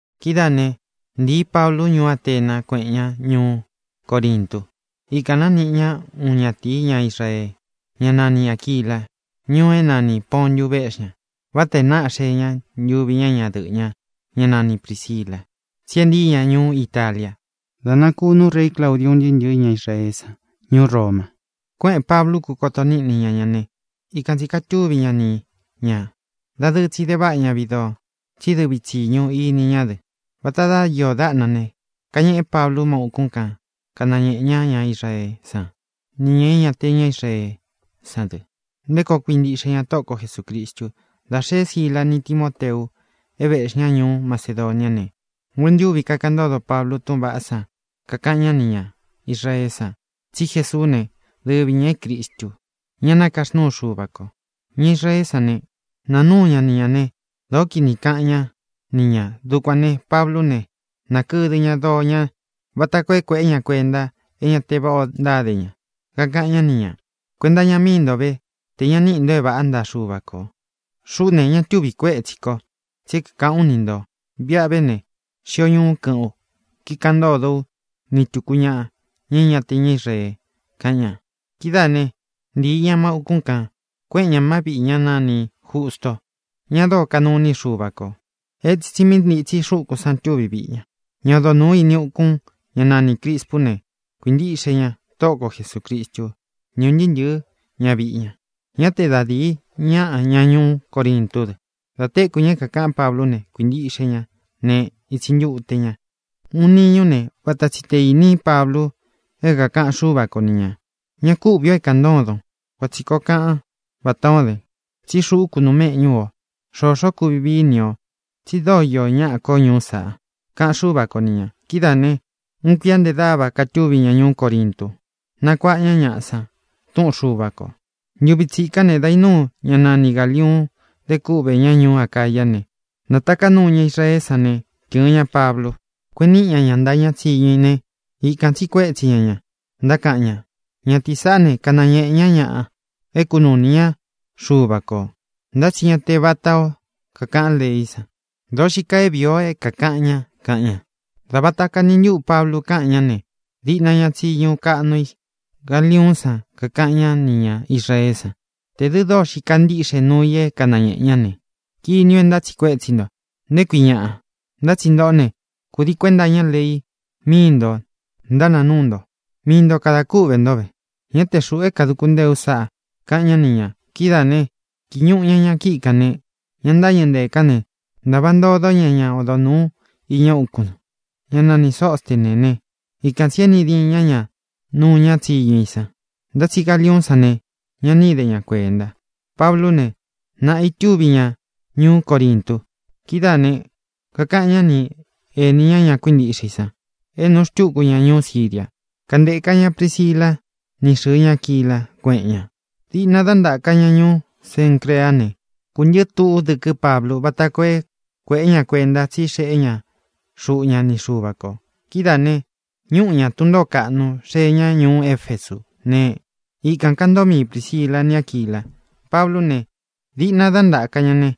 Kidáā né, ntīí Pablu ñuú Atena, kuéꞌen ña ñuú Corintu. Ikān nániꞌi ña uun ñatīi, ñá Israee, ñá nani Āquila. Ñuu é nanī Pontu véꞌxi ña. Vata e náꞌa xee ña, ntuvi ñá ñadɨꞌɨ̄ ña, ñá nani Prīsila. Tsí e ntíi ña ñuú Italia da nakunú rei Claudiu ún ntɨɨ́ ntɨ̄ɨ́ ña Israeé san ñuú Roma. Kuéꞌēn Pablu, kúkoto níꞌni ña ña ne, ikan tsī katúvi ña ni ñā. Dadɨɨ tsi de váꞌa ña viꞌi doo, tsí dɨvi tsi tsīñu ini ñá dɨ. Vatā dá iō dáꞌna ne, kañeꞌé Pablu má ūkún kan, kanañēꞌe ña ña Israeé san nī ña é ña te ña Israeé san dɨ nté koo kuintiꞌxe ña Tóꞌo ko Jesūcristu. Dā xeé Síla ni Timōteu, é vēꞌxí ña ñuú Macedoniá ne, nguentúvi kakaꞌan ntódo Pablu túꞌūn vaꞌá san, kakaꞌan ñá nī ña Israeé san tsí Jesuú ne, dɨvi ñā é Cristu, ñá nakaxnúu Xuva kō. Ña Israeé san ne, naa núu ña ni ñā ne, dōó kini kaꞌan ñá ni ñā. Dukuān ne, Pablú ne, nākɨdɨ ña doo ña vata koo é kuēꞌé ña kuenta é ñā te váꞌa ō ntáde ña. Kakaꞌan ñá ni ñā: —Kuenta iña mii nto ve te ña níꞌi nto é vāꞌá ntaꞌa Xuva kō. Xuꞌú ne, ña túvi kuētsí ko, tsí é kākaꞌán u ni ntō. Viꞌa ve ne, xio ñuú kɨꞌɨ́n u, kíkaꞌan ntódo ú ni tūku ñaꞌa, ña é ña te ña Israee —kaꞌan ña. Kidáa ne, ntīi ña má ūkún kān, kuéꞌen ña má viꞌī ñá nanī Justo, ña dóo kanuu iní i Xuva kō. Etsin tsi mí ntitsi xúkūn san tuví viꞌi ña. Ña odo nūu ini ukun, ñá nanī Crispú ne, kuīntiꞌxe ña Tóꞌo ko Jesūcristu ni ún ntɨɨ́ ntɨ̄ɨ́ ñaviꞌi ña. Ñá te da dīi ñaꞌa, ña ñuú Corintú dɨ, dā téku ña é kākaꞌán Pablú ne, kuīntiꞌxe ña ne, ītsi ntute ña. Uun niñú ne, vata tsi tē íni Pablu é kākaꞌan Xúva ko ni ñā: —Ñá ku uꞌvī o é kāꞌan ntódon. Kuan tsī koo kaꞌan vátā ó den, tsí xuꞌú kunuu méꞌñū ú o. Xōxó kuvi víi i ni o, tsi dóo iō ñáꞌa ko ñuú saꞌa —kaꞌan Xúva ko ni ñā. Kidáā ne, uun kuia nte dáva kātúvi ña ñuú Corintu, nakuáꞌa ña ñaꞌa san túꞌun Xuva kō. Ntuvi tsikán ne, dā inúu ñá nani Gāliuun, de kúꞌvē ñá ñuú Acayá ne, nātaká nuu ña Israeé san ne, tɨ̄ɨn ña Pablu, kueꞌen níꞌi ña ña ntaꞌa ña tsíñu i ne, ikān tsíꞌi kuétsi ña ña, ntákaꞌan ña: —Ñatīí saꞌá ne, kanañēꞌe ñá ñaꞌa é kūnuu ini ñá Xuva kō, ntá tsi ña te vatā ó kakaꞌan leí san. Dōo xíi kaa é vīi o é kākaꞌan ña —kaꞌan ña. Dā vata kani ntúꞌu Pablu káꞌan ñá ne, diꞌna ña tsiñu kaꞌnu i Galiuún san kakaꞌan ñá nī ña Israeé san: —Tē dɨ́ dóo xii kaa ntiꞌxé nuu i é kanañēꞌe ña ne, kiní u é ntátsiꞌi kuétsi nto, ¿nté kui ñaꞌa? Ntá tsi ntōꞌó ne, kūdii kuénta iña lei míi nto ntánāa núu nto. Mii nto kadā kúꞌvē ntó ve. Ñá te xūꞌu é kāduku ntée ú sáꞌa —kaꞌan ñá ni ñā. Kidáā ne, kīi ñuꞌu ña ña kíꞌi kān ne, ña ntáñɨ̄ ntée kān né, ntāva ntodó ña ñá odo nūu iña úkūn, ñá nani Sōstené ne, ikan tsī éꞌni diín ña ña nuu ña tsíñu i san. Ntá tsi Galiuún san ne, ña ni íde ña kuenta. Pablú ne, naꞌā itúvi ña ñuú Corintu. Kidáā ne, kakaꞌan ñá ni ēní ña ña kuíntiꞌxe i san é nūꞌu xtúku ña ñuú Siria. Kántēká ña Prisila ni xɨ́ɨ ña Aquila, kuéꞌen ña. Diꞌna dá ntáka ña ñuú Cencreá ne, kūntɨɨ́ tduꞌu dɨ́kɨ́ Pablu váta koo é kueꞌe ña kuenta tsí xeꞌé ña xuꞌu ña ni Xuva kō. Kidáā ne, ñúꞌu ña tun ntōó kaꞌnu, xee ñá ñuú Efesú ne, ikān kantóo mii Prīsila ni Áquila. Pablú ne, diꞌna dá ntaka ña ne,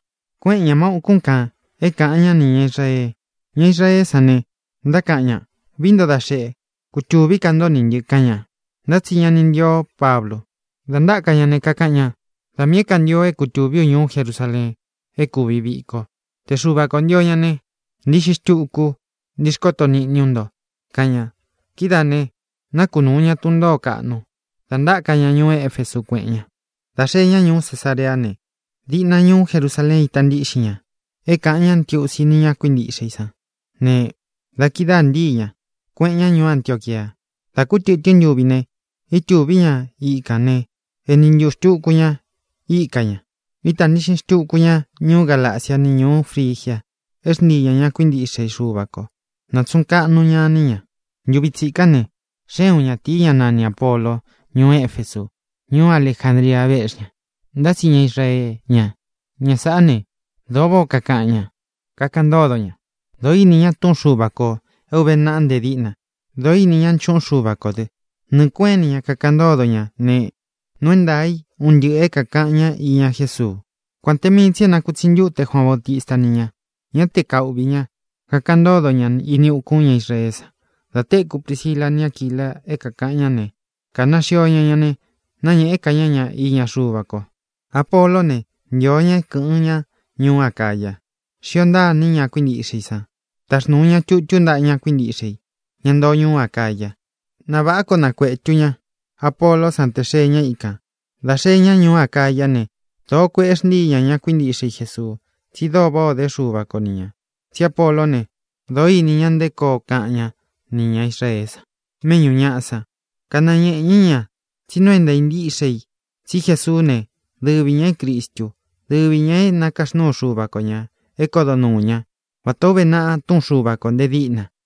kuéꞌen ñā má ūkún kān é kāꞌan ñá nī ña Israee. Ña Israeé san ne, ntákaꞌan ña: —Vií nto da xeꞌe, kutuvī ká nto nī ntɨ —kaꞌan ña. Ntá tsi ña ni ntío Pablu. Dā ntáka ña ne, kakaꞌan ña: —Da miī é kantio é kutūví u ñuú Jerusaleen é kūvi viko. Te Xuva kō ntio ñá ne, ntiꞌxi xtuku ú, ntixkoto niꞌni ú nto —kaꞌan ña. Kidáā ne, nákunūu ña tun ntōó kaꞌnu da ntáka ña ñuú Efesu, kuéꞌen ña. Dā xee ñá ñuú Cesareá ne, diꞌna ñuú Jerusaleen ita ntíꞌxin ña é kāꞌan ñá ntiusi ni ña kuíntiꞌxe i sán ne, da kidáā ntíi ña, kueꞌen ña ñuú Antioquia. Dā kú tɨtɨ́n ntuvi itúvi ña ikān né, eni ntuꞌū xtuku ña ika ña. Ítā ntiꞌxin xtuku ña ñuú Galacia ni ñuú Frigia é xntíi ña ña kuíntiꞌxe Xuva ko, nātsuꞌun kaꞌnu ña iní ña. Ntuvi tsikán ne, xée uun ñatīi, ñá nani Āpolo, ñuú Efesu. Ñuú Alejandria véꞌxi ña, ntá tsi ña Israee ña. Ña sāꞌá ne, dōo váꞌā ó kakaꞌan ña, kakaꞌan ntódo ña; dōó ini ña túꞌun Xuva kō é ūve naꞌa nte díꞌna. Dōo ini ñá nchuꞌun Xúva kō dɨ. Nɨɨ̄ kueꞌén ini ña kakaꞌan ntódo ña ne, nuu é ntaā í un ntɨꞌɨ̄ é kākaꞌan ñá iña Jésuu, kuān te mii tsi é nakutsi ntute Juaan Bautista íni ña. Ñá te kauꞌvī ña, kakaꞌan ntódo ña ini ukún ña Israeé san. Dā téku Prisila ni Áquila é kākaꞌan ñá ne, kāna xio ña ña ne, náñēꞌé ka ñá ña iña Xuva ko. Apoló ne, ntio ña é kɨ̄ꞌɨn ñá ñuú Acáya. Xíō ntaa iní ña kuíntiꞌxe i san. Táxnūu ña tutú ntaꞌa ña kuíntiꞌxe i, ña ntoo ñuú Acaya, na vāꞌá koo nakuetu ña Apoló san tē xee ña ikan. Dā xee ñá ñuú Acayá ne, dōó kueꞌe xntíi ña ña kuíntiꞌxe i Jesuu, tsí dóo váꞌā o dé Xuva ko ni ñā. Tsí Apoló ne, dōó ini ña nté koo kaꞌan ñá nī ña Israeé san méꞌñū ñaꞌa san, kanañēꞌe ñá ña tsí nuu é ntāa ntíꞌxe i tsí Jesuú ne, dɨvi ñā é Cristú, dɨvi ñā é nakaxnúu Xuva ko ñā é kodo nuū ñá, vatā ó uve naꞌa túꞌun Xuva kō nte díꞌna.